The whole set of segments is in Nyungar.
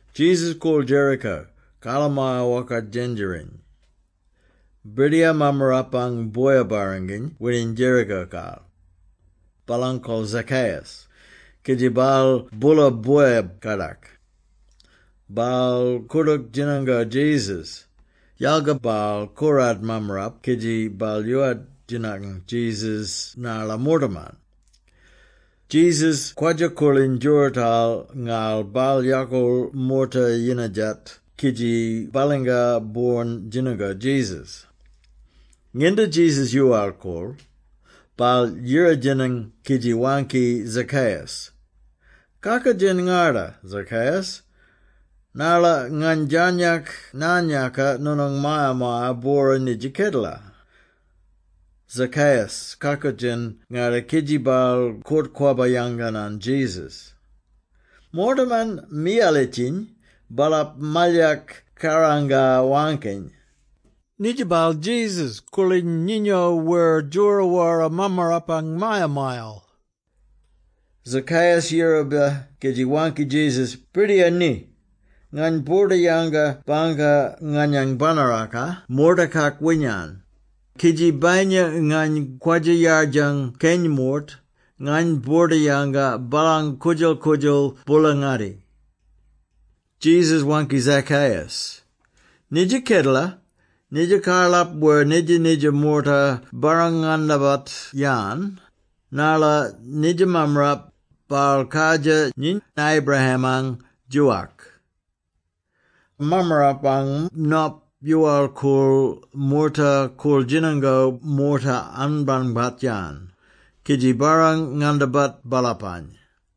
Jesus koorl Jericho, karlamaya-wokart djendjeriny. Birdiyar mammarapang boya-barranginy wining Jericho-kal. Baalang kol Zacchaeus, kidji baal boola boya-kadak. Baal koordook djinango Jesus, yalga baal korad mammarap kidji baal yoowart djinang Jesus narla moortaman. Jesus kwadja-koorliny djoorootal ngarl baal yakoorl moorta-yinadjat kidji balingar boorn djinango Jesus. Nginda Jesus yoowal-koorl, baal yira-djinang kidji waangki Zacchaeus, “Kakoodjen ngarda, Zacchaeus, narla ngany djarnyak naan-yaaka noonang maya-maya-bwora nidja kedela.” Zacchaeus kakoodjen ngarda kidji baal koort-kwabba yanganan Jesus. Moortaman miyalitjiny, baalap malyak kaaranga-waangkiny, “Nidja baal Jesus koorliny nyinyo wer djoro wara mammarapang maya-mayal!” Zacchaeus yiraba kidji waangki Jesus, “Birdiyar! Ni! Ngany boorda-yanga bangka nganyang banaraka moortakak winyan, kidji bayinya ngany kwadja-yardjang keny moort, ngany boorda-yanga baalany koodjal-koodjal boola-ngatti.” Jesus waangki Zacchaeus, “Nidja kedela, nidja karlap wer nidja-nidja moorta barrang-ngandabat-yan, narla nidja mammarap, baal kardjir nyiny Abraham-ang djoowak. Mammarapang Nop yoowal-koorl moorta koorl-djinango moorta anbangbat-yan, kidji barrang-ngandabat baalapany.”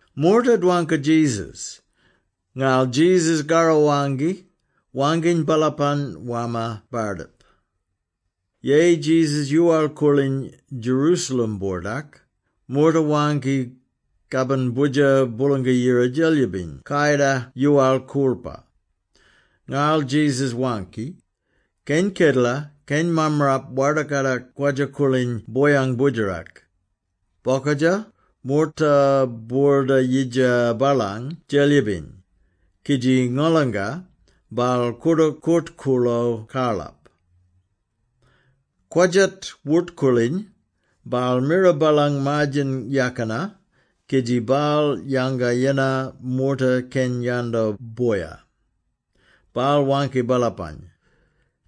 Moorta dwangka Jesus, ngarl Jesus karro waangki, waangkiny baalapany warma bardip. Yeyi Jesus yoowal-koorliny Jerusalem-boordak, moorta waangki kabin Boodjer Boolanga-Yira Djelyibiny kayida yoowal-koorlpa. Ngarl Jesus waangki, “Keny kedela, keny mammarap warda-kadak kwadja-koorliny boyang boodjerak. Bokadja, moorta boorda-yidja baalany Djelyib-biny, kidji ngolanga, baal koordook koort-koorlo karlap. Kwadjat wort-koorliny, baal mira baalang maar-djen yakina kidji baal yanga yennar moorta keny yando boya. Baal waangki baalapany,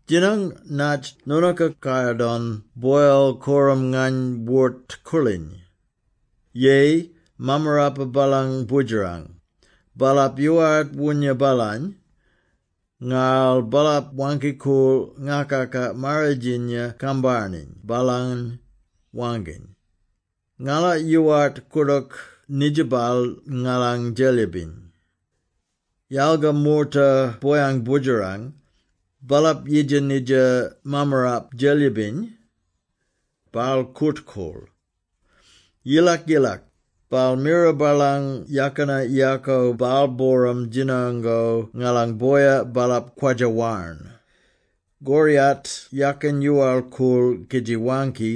‘Djinang natj noonooka kayar-don boyal korram ngany wort-koorliny.’ Yeyi, mammarapa baalang boodjerang, baalap yoowart woonya baalany, ngarl baalap waangki-koorl ngakaka-marridjinya kambarniny baalany, waangkiny, ‘Ngala yoowart koordook nidja baal ngalang Djelyib-biny.’ Yalga moorta boyang boodjerang, baalap yidja nidja mammarap djelyib-biny. Baal koort-koorl. Yilak-yilak, baal mira baalang yakina yaako baal-booram djinango ngalan boya baalap kwadja-warn. Koryat yakin yoowal-koorl kidji waangki,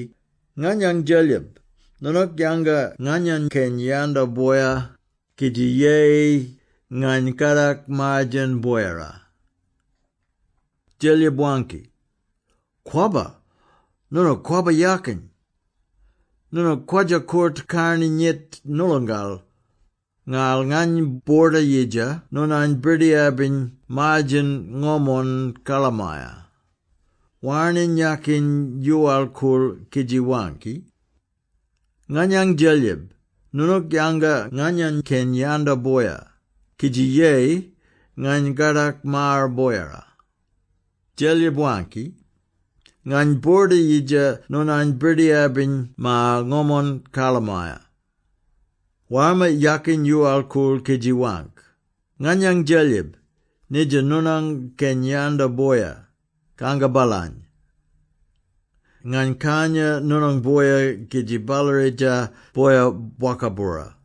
‘Nganyang Djelyib, noonook yanga nganyany keny yando boya, kidji yeyi, ngany kadak maar-djen boyara.’ Djelyib waangki, ‘Kwabba! Noonook kwabba yakin! Noonook kwadja-koort-karni nyit noolongal, ngarl ngany boorda-yidja noonany birdiyar-biny maar-djen ngomon karlamaya.’ Warning yakin yoowal-koorl kidji waangki, ‘Nganyang Djelyib, noonook yanga nganyany keny yando boya, kidji yeyi, ngany kadak maar boyara.’ Djelyib waangki, ‘Ngany boorda-yidja noonany birdiyar-biny maar ngomon karlamaya.’ Warma yakin yoowal-koorl kidji waangk, ‘Nganyang Djelyib, nidja, noonang keny yando boya, kanga baalany. Ngany kanya noonang boya kidji ballaridja boya bwoka-bwora.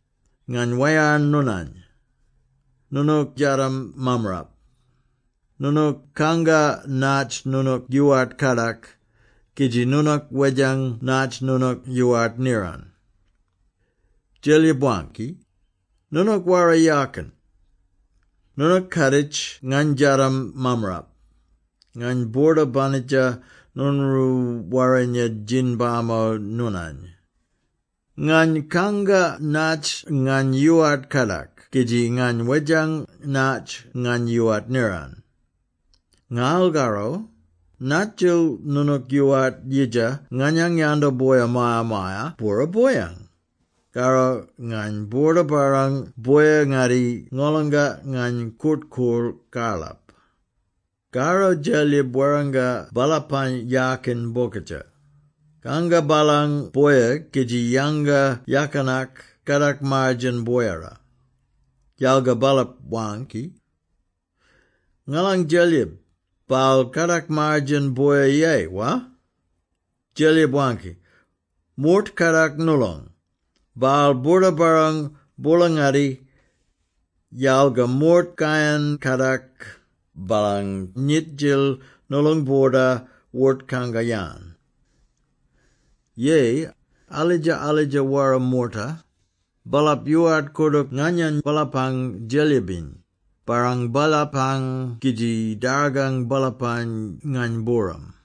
Ngany wayarn noonany. Noonook djadam mammarap. Noonook kanga natj noonook yoowart kadak kidji noonook wedjang natj noonook yoowart niran.’ Djelyib waangki, ‘Noonook wara yakin! Noonook kaaditj ngany djadam mammarap. Ngany boorda-banidja noonroo warrinya djin-bamo noonany! Ngany kanga natj ngany yoowart kadak kidji ngany wedjang natj ngany yoowart niran. Ngarl karro, nadjil noonook yoowart yidja nganyang yando boya maya-maya-bwora boyang? Karro ngany boorda-barrang boya-ngatti ngolonga ngany kort-koorl karlap.’ Karro Djelyib warranga baalapany yaakiny bokadja, ‘Kanga baalang boya kidji yanga yakinak kadak maar-djen boyara.’ Yalga baalap waangki, ‘Ngalang Djelyib, baal kadak maar-djen boya yeyi, wa?’ Djelyib waangki, ‘Moort kadak noolong, baal boorda-barrang boola-ngatti. Yalga moort kayan-kadak, baalang nyit-djil noolong boorda wort-kanga-yan. Yeyi, alidja-alidja wara moorta, baalap yoowart koordook nganyany baalapang Djelyib-biny, barrang baalapany kidji dargang baalapany ngany-booram.’”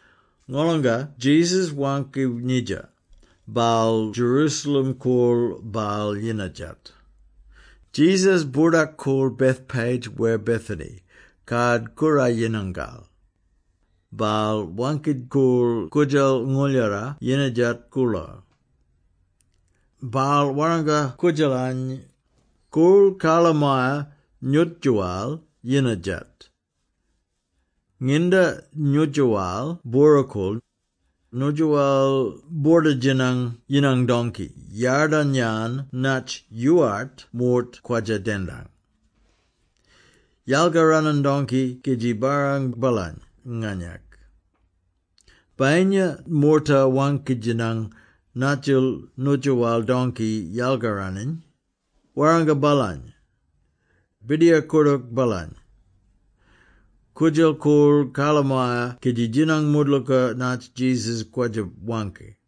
Ngolonga Jesus waangki nidja, baal Jerusalem koorl baal-yinadjat. Jesus boordak-koorl Bethphage wer Bethany, Kard-Koorayinangal. Baal waangki-koorl koodjal ngooldjara yinadjat-koorlo. Baal warranga koodjalany, “Koorl karlamaya nyootjoowal-yinadjat. Nginda nyootjoowal bwora-koorl, nyootjoowal boorda-djinang yinang dongki yadarn-yan natj yoowart moort kwadja-dendang. Yalkaranan dongki kidji barrang baalany nganyak. Bayinya moorta waangki-djinang nadjil nyootjoowal dongki yalkaraniny, warranga baalany, ‘Birdiyar koordook baalany.’” Koodjal koorl karlamaya kidji djinang moodlooka natj Jesus kwadja-waangki.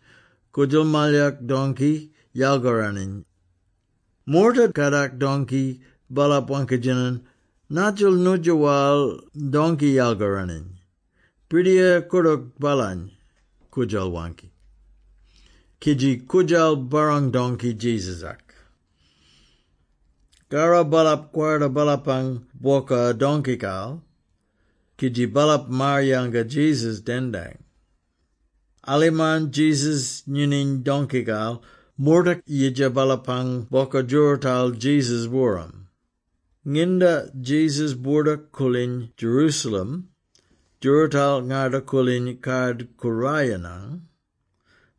Koodjal malyak dongki yalkaraniny. Moorta kadak dongki, baalap waangki-djinang, “Nadjil nyootjoowal dongki yalkaraniny?” “Birdiyar koordook baalany,” koodjal waangki. Kidji koodjal barrang dongki Jesus-ak. Karro baalap kwarda baalapang bwoka dongkikal, kidji baalap maar-yanga Jesus dendang. Alimarn Jesus nyinyiny dongkikal, moorta yidja baalapang bwoka djoorootal Jesus-booram. Nginda Jesus boordak-koorliny Jerusalem djoorootal ngarda-koorliny Kard-Koorayinang,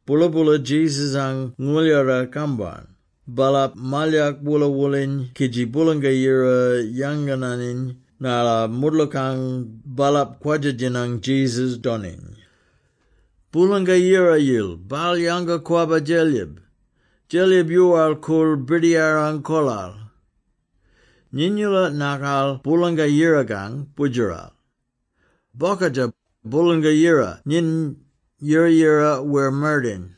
boola-boola Jesus-ang ngooljdara-kambarn, baalap malyak woola-wooliny kidji Boolanga-Yira yangananiny narla moodlookang baalap kwadja-djinang Jesus doniny. “Boolanga-Yirayil, baal yanga-kwabba Djelyib. Djelyib yoowal-koorl Birdiyarang kolal! Nyiny-oola nakal Boolanga-Yirakang Boodjeral! Bokadja, Boolanga-Yira nyiny, yira-yira wer mardayin!”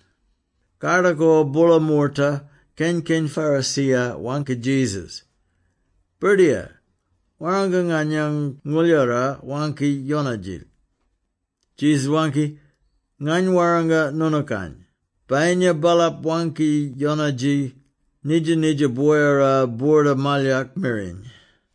Kardakor boola moorta, keny-keny Pharisee-ya waangki Jesus, “Birdiyar, warranga nganyang ngooljdara waangki-yonadji.” Jesus waangki, “Ngany warranga noonookany, bayinya baalap waangki-yonadji, nidja-nidja boyara boorda malyak miriny.”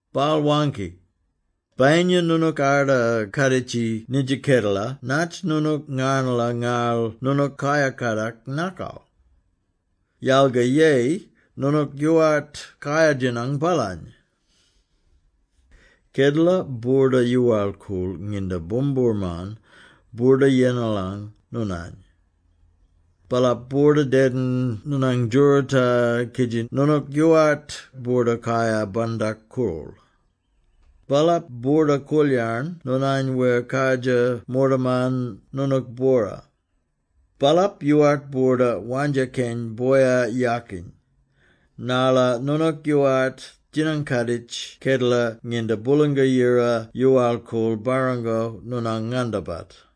Baal waangki, “Bayinya noonook arda kaaditji nidja kedela natj noonook ngarnala ngarl noonook kayar kadak nakal! Yalga yeyi noonook yoowart kayar-djinang baalany! Kedela boorda-yoowal-koorl nginda boomboorman boorda-yengalang noonany. Baalap boorda-dedin noonang djooroota kidji noonook yoowart boorda-kayar-bandak-koorl. Baalap boorda-koolyarn noonany wer kardjir moortaman noonook-bwora. Baalap yoowart boorda wandja keny boya yaakiny, narla noonook yoowart djinang-kaaditj kedela nginda Boolanga-Yira yoowal-koorl barrango noonang ngandabat!”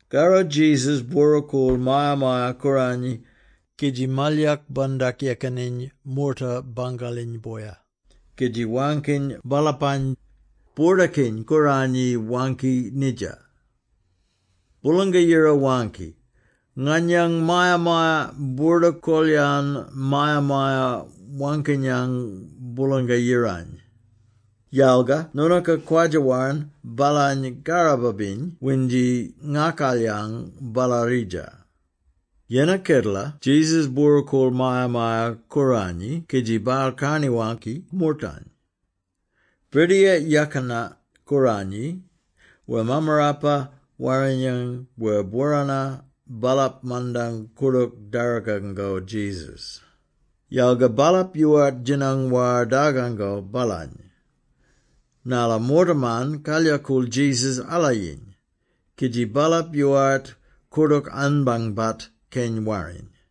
Karro Jesus bwora-koorl Maya-maya-Kooranyi kidji malyak bandak-yekaniny moorta bangaliny boya, kidji waangkiny baalapany, “Boordakiny-Kooranyi waangki nidja: Boolanga-Yira waangki, ‘Nganyang maya-maya boorda-kol-yan maya-maya waangkinyang Boolang-Yirany.’ Yalga noonooka kwadja-warn baalany karraba-biny windji ngakalyang ballaridja!” Yennar kedela Jesus bwora-koorl Maya-maya-Kooranyi kidji baal karni-waangki moortany. Birdiyar Yakina-Kooranyi wer Mammarapa-Warrinyang wer bworana, baalap mandang koordook dargango Jesus, yalga baalap yoowart djinang war dargango baalany, narla moortaman kalyakool Jesus alayiny, kidji baalap yoowart koordook anbangbat keny warriny.